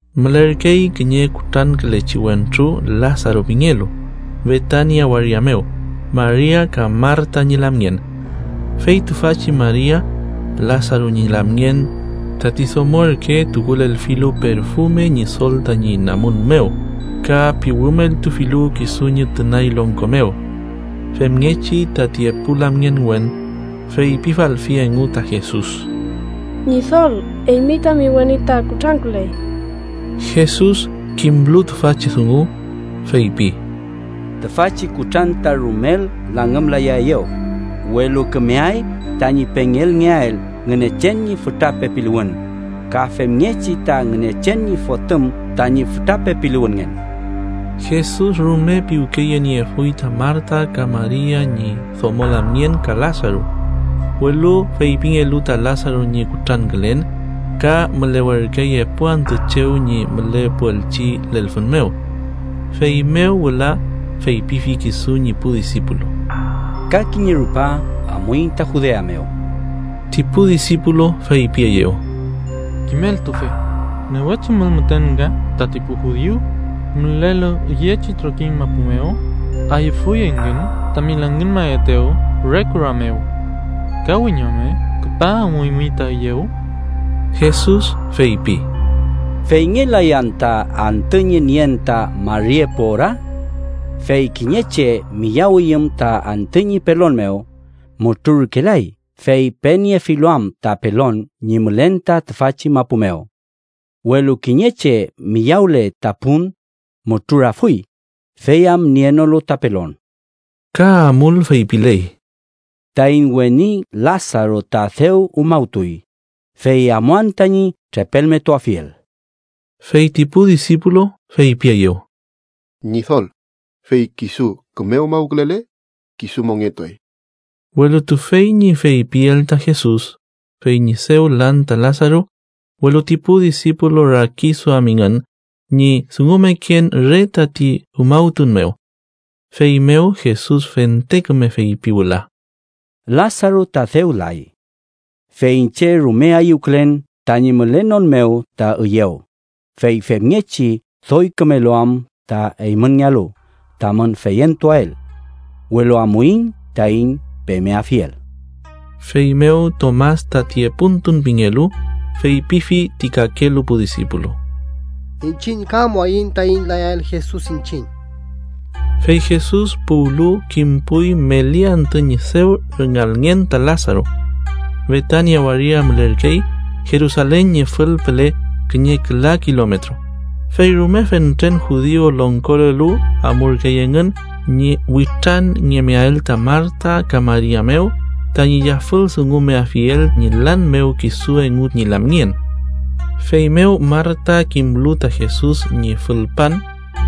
Mülerkey kiñe kutrankülechi wentru Lasaru pingelu, Betania waria mew Maria ka Marta ñi lamngen. Fey tüfachi Maria, Lasaru ñi lamngen, tati domo ürke tukulelfilu perfume Ñidol tañi namun mew, ka piwümeltufilu kisu ñi tünay longko mew. Femngechi tati epu lamngenwen feypifalfi engu ta Jesus: —Ñidol, eymi tami weni ta kutranküley. Jesus, kimlu tüfachi dungu, feypi: —Tüfachi kutran ta rumel langümlayaeyew, welu kümeay tañi pengelngeael Ngünechen ñi fütra pepiluwün, ka femngechi ta Ngünechen ñi Fotüm tañi fütra pepiluwünngen. Jesus rume piwkeyeniefuy ta Marta ka Maria ñi domo lamngen ka Lasaru, welu feypingelu ta Lasaru ñi kutrankülen ka mülewerkey epu antü chew ñi mülepuelchi lelfün mew. Feymew wüla feypifi kisu ñi pu disipulu: —Ka kiñe rupa amuiñ ta Judea mew. Ti pu disipulu feypieyew: —Kimeltufe, newe chumül müten nga tati pu judiu mülelu üyechi trokiñ mapu mew, ayüfuy engün tami langümafetew re kura mew. ¿Ka wiñome küpa amuymi ta üyew? Jesus feypi: —¿Feyngelay anta antü ñi nien ta mari epu ora? Fey kiñe che miyawiyüm ta antü ñi pelon mew, mutrurkelay, fey peniefilu am ta pelon ñi mülen ta tüfachi mapu mew. Welu kiñe che miyawle ta pun, mutrurafuy, fey am nienolu ta pelon. Ka amul feypiley: —Taiñ weni Lasaru ta dew umawtuy, fey amuan tañi trepelmetuafiel. Fey ti pu disipulu feypieyew: —Ñidol, fey kisu küme umawkülele, kisu mongetuay. Welu tüfey ñi feypiel ta Jesus fey ñi dew lan ta Lasaru, welu ti pu disipulu rakiduamingün ñi dungumeken re tati umawtun mew. Feymew Jesus fente küme feypi wüla: —Lasaru ta dew lay. Fey iñche rume ayüwkülen tañi mülenon mew ta üyew, fey femngechi doy kümelu am ta eymünngealu tamün feyentuael. Welu amuiñ taiñ pemeafiel. Feymew Tomas, tati epuntun pingelu, feypifi ti kakelu pu disipulu: —Iñchiñ ka amuaiñ taiñ layael Jesus iñchiñ. Fey Jesus puwlu, kimpuy meli antü ñi dew rüngalngen ta Lasaru. Betania waria mülerkey Jerusalen ñi fülpüle kiñe küla kilometro, fey rume fentren judiu longkolelu amurkey engün ñi witranngemeael ta Marta ka Maria mew, tañi yafüldungumeafiel ñi lan mew kisu engu ñi lamngen. Feymew Marta kimlu ta Jesus ñi fülpan,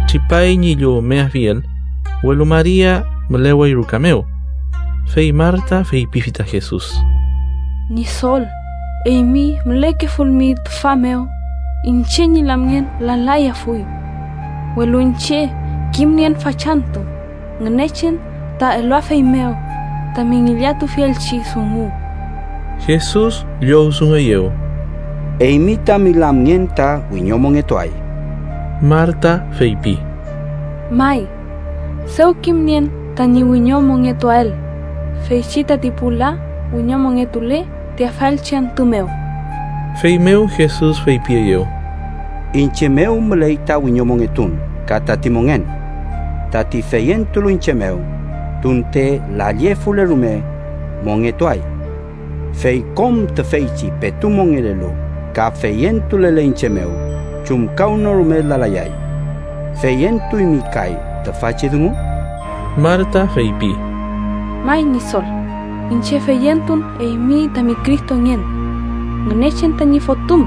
tripay ñi llowmeafiel, welu Maria mülewey ruka mew. Fey Marta feypifi ta Jesus: —Ñidol, eymi mülekefulmi tüfa mew, iñche ñi lamngen lalayafuy. Welu iñche kimnien fachantü Ngünechen ta eluafeymew tami ngillatufielchi dungu. Jesus llowdungueyew: —Eymi tami lamngen ta wiñomongetuay. Marta feypi: —May, dew kimnien tañi wiñomongetuael, feychi tati pu la wiñomongetule ti afaelchi antü mew. Feymew Jesus feypieyew: —Iñche mew müley ta wiñomongetun ka tati mongen. Tati feyentulu iñche mew, tunte lallefule rume, mongetuay. Fey kom tüfeychi petu mongelelu ka feyentulele iñche mew chumkawnorume lalayay. ¿Feyentuymi kay tüfachi dungu? Marta feypi: —May, Ñidol, iñche feyentun eymi tami Cristongen, Ngünechen tañi Fotüm,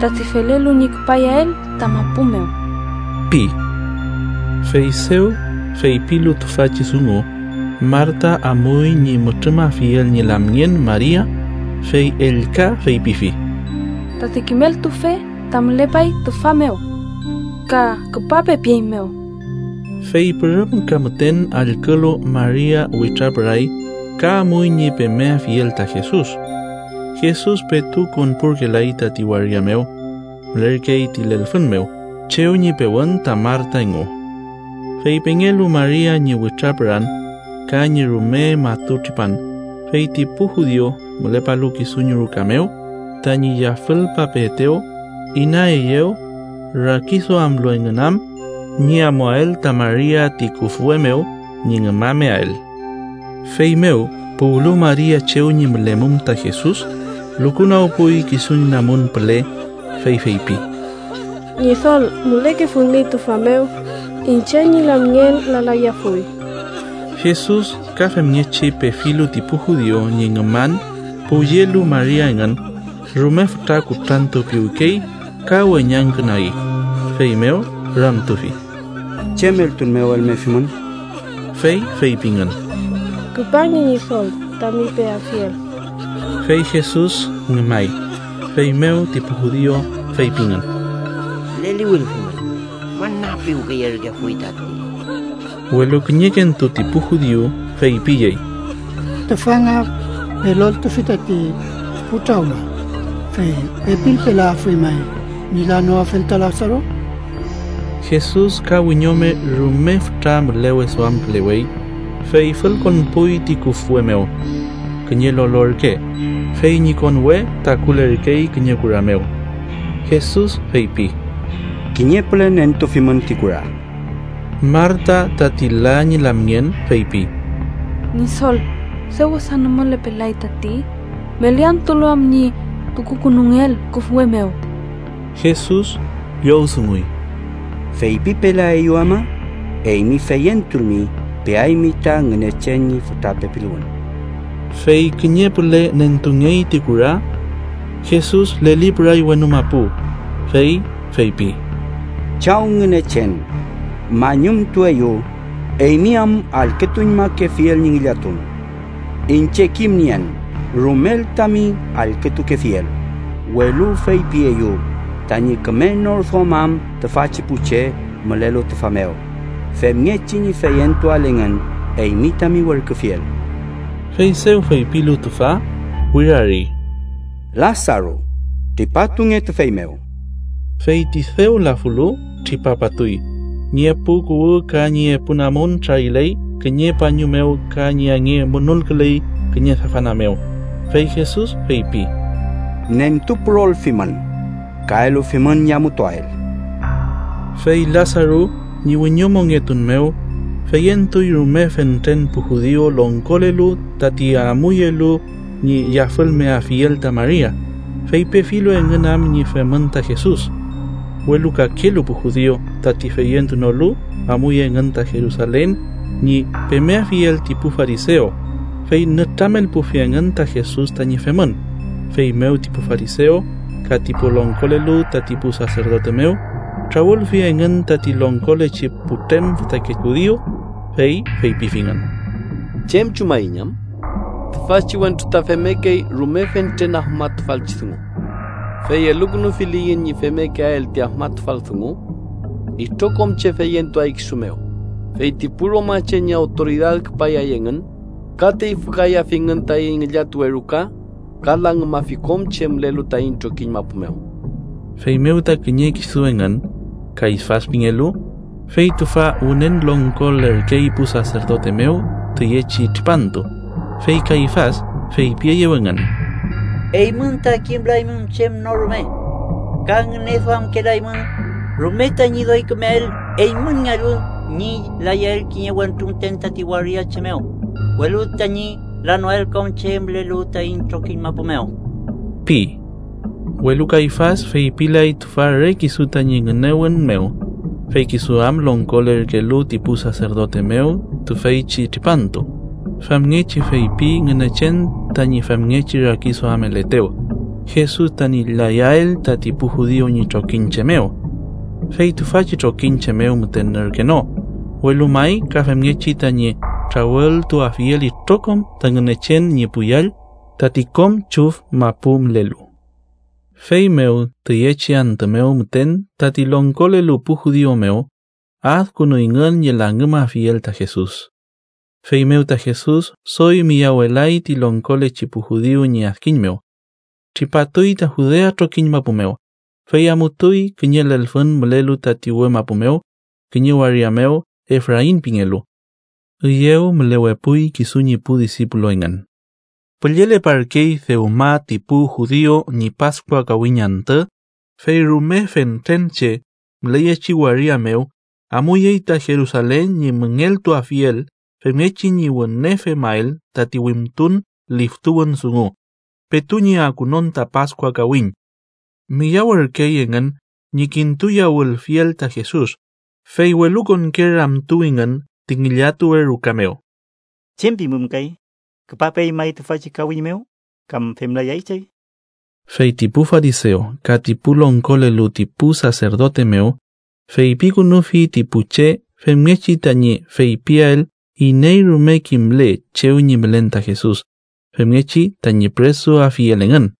tati felelu ñi küpayael ta mapu mew ―pi. Fey dew feypilu tüfachi dungu, Marta amuy ñi mütrümafiel ñi lamngen Maria, fey ellka feypifi: —Tati kimeltufe ta mülepay tüfa mew ka ‘küpape’ pieymew. Fey pürüm ka müten allkülu, Maria witrapüray ka amuy ñi pemeafiel ta Jesus. Jesus petu konpurkelay tati waria mew, mülerkey ti lelfün mew chew ñi pewün ta Marta engu. Fey pengelu Maria ñi witrapüran ka ñi rume matu tripan, fey ti pu judiu mülepalu kisu ñi ruka mew, tañi yafülpapeetew, inaeyew, rakiduamlu engün am ñi amuael ta Maria ti küfwe mew ñi ngümameael. Feymew puwlu Maria chew ñi mülemum ta Jesus, lukunagpuy kisu ñi namun püle, fey feypi: —Ñidol, mülekefulmi tüfa mew, iñche ñi lamngen lalayafuy. Jesus, ka femngechi pefilu ti pu judiu ñi ngüman puwyelu Maria engün, rume fütra kutrantupiwkey ka weñangkünagi, feymew ramtufi: —¿Chem eltun mew elmefimün? Fey feypingün: —Küpange, Ñidol, tami peafiel. Fey Jesus ngümay. Feymew ti pu judiu feypingün: —¡Leliwülfimün, müna piwkeyerkefuy tati! Welu kiñekentu ti pu judiu feypiyey: —Tüfa nga peloltufi tati pu trawma, fey ¿pepilpelayafuy may ñi lanoafel ta Lasaru? Jesus, ka wiñome rume fütra müleweduamkülewey, fey fülkonpuy ti küfwe mew. Kiñe lolo ürke, fey ñi konwe takulerkey kiñe kura mew. Jesus feypi: —Kiñe püle nentufimün ti kura. Marta tati la ñi lamngen feypi: —Ñidol, dew wesa nümüpelay tati, meli antülu am ñi tukukünungeel küfwe mew. Jesus llowdunguy: —¿Feypipelaeyu ama, eymi feyentulmi, peaymi ta Ngünechen ñi fütra pepiluwün? Fey kiñe püle nentungey ti kura. Jesus lelipüray wenu mapu, fey feypi: —Chaw Ngünechen, mañumtueyu eymi am allkütuñmakefiel ñi ngillatun. Iñche kimnien rumel tami allkütukefiel, welu feypieyu tañi küme nor duamam tüfachi pu che mülelu tüfa mew femngechi ñi feyentuael engün eymi tami werküfiel. Fey dew feypilu tüfa, wirari: —¡Lasaru, tripatunge tüfey mew! Fey ti dew lafulu tripapatuy, ñi epu kuwü ka ñi epu namun trariley kiñe pañu mew ka ñi ange munulküley kiñe safana mew, fey Jesus feypi: —Nentupürolfimün ka elufimün ñi amutuael. Fey Lasaru ñi wiñomongetun mew, feyentuy rume fentren pu judiu longkolelu tati amuyelu ñi yafülmeafiel ta Maria, fey pefilu engün am ñi femün ta Jesus. Welu kakelu pu judiu, tati feyentunolu, amuy engün ta Jerusalen ñi pemeafiel ti pu farisew, fey nütramelpufi engün ta Jesus tañi femün. Feymew ti pu farisew ka ti pu longkolelu tati pu saserdote mew, trawülfi engün tati longkolechi putrem fütake judiu, fey feypifingün: —¿Chem chumaiñ am? Tüfachi wentru ta femmekey rume fentren afmatufalchi dungu. Fey elukünufiliyiñ ñi femmekeael ti afmatufal dungu itrokom che feyentuay kisu mew, fey ti pu romache ñi awtoridad küpayay engün ka teyfükayafingün taiñ ngillatuwe ruka ka langümafi kom che mülelu taiñ trokiñ mapu mew. Feymew ta kiñe kisu engün, Kayfas pingelu, fey tüfa wünen longkolerkey pu saserdote mew tüyechi tripantu, fey Kayfas feypieyew engün: —Eymün ta kimlaymün chem no rume. Ka ngüneduamkelaymün rume tañi doy kümeael eymünngealu ñi layael kiñe wentru müten tati waria che mew, welu tañi lanoael kom che mülelu taiñ trokiñ mapu mew ―pi. Welu Kayfas feypilay tüfa re kisu tañi ngünewün mew, fey kisu am longkolerkelu ti pu saserdote mew tüfeychi tripantu, famngechi feypi Ngünechen tañi femngechi rakiduameletew, Jesus tañi layael tati pu judiu ñi trokiñche mew. Fey tüfachi trokiñche mew müten ürke no, welu may ka femngechi tañi trawültuafiel itrokom ta Ngünechen ñi pu yall tati kom chüf mapu mülelu. Feymew tüyechi antü mew müten tati longkolelu pu judiu mew adkünuyngün ñi langümafiel ta Jesus. Feymew ta Jesus doy miyawelay ti longkolechi pu judiu ñi adkiñ mew. Tripatuy ta Judea trokiñ mapu mew, fey amutuy kiñe lelfün mülelu tati uwe mapu mew, kiñe waria mew Efrain pingelu. Üyew mülewepuy kisu ñi pu disipulu engün. Pülleleparkey dewma ti pu judiu ñi Paskua kawiñ antü, fey rume fentren che müleyechi waria mew amuyey ta Jerusalen ñi müngeltuafiel femngechi ñi wüne femael tati wimtun liftuwün dungu petu ñi akunon ta Paskua kawiñ. Miyawürkey engün ñi kintuyawülfiel ta Jesus, fey welukonke ramtuwingün ti ngillatuwe ruka mew: —¿Chem pimün kay? ¿Küpapeay may tüfachi kawiñ mew kam femlayay chey? Fey ti pu farisew ka ti pu longkolelu ti pu saserdote mew feypikünufi ti pu che femngechi tañi feypiael iney rume kimle chew ñi mülen ta Jesus, femngechi tañi püresuafiel engün.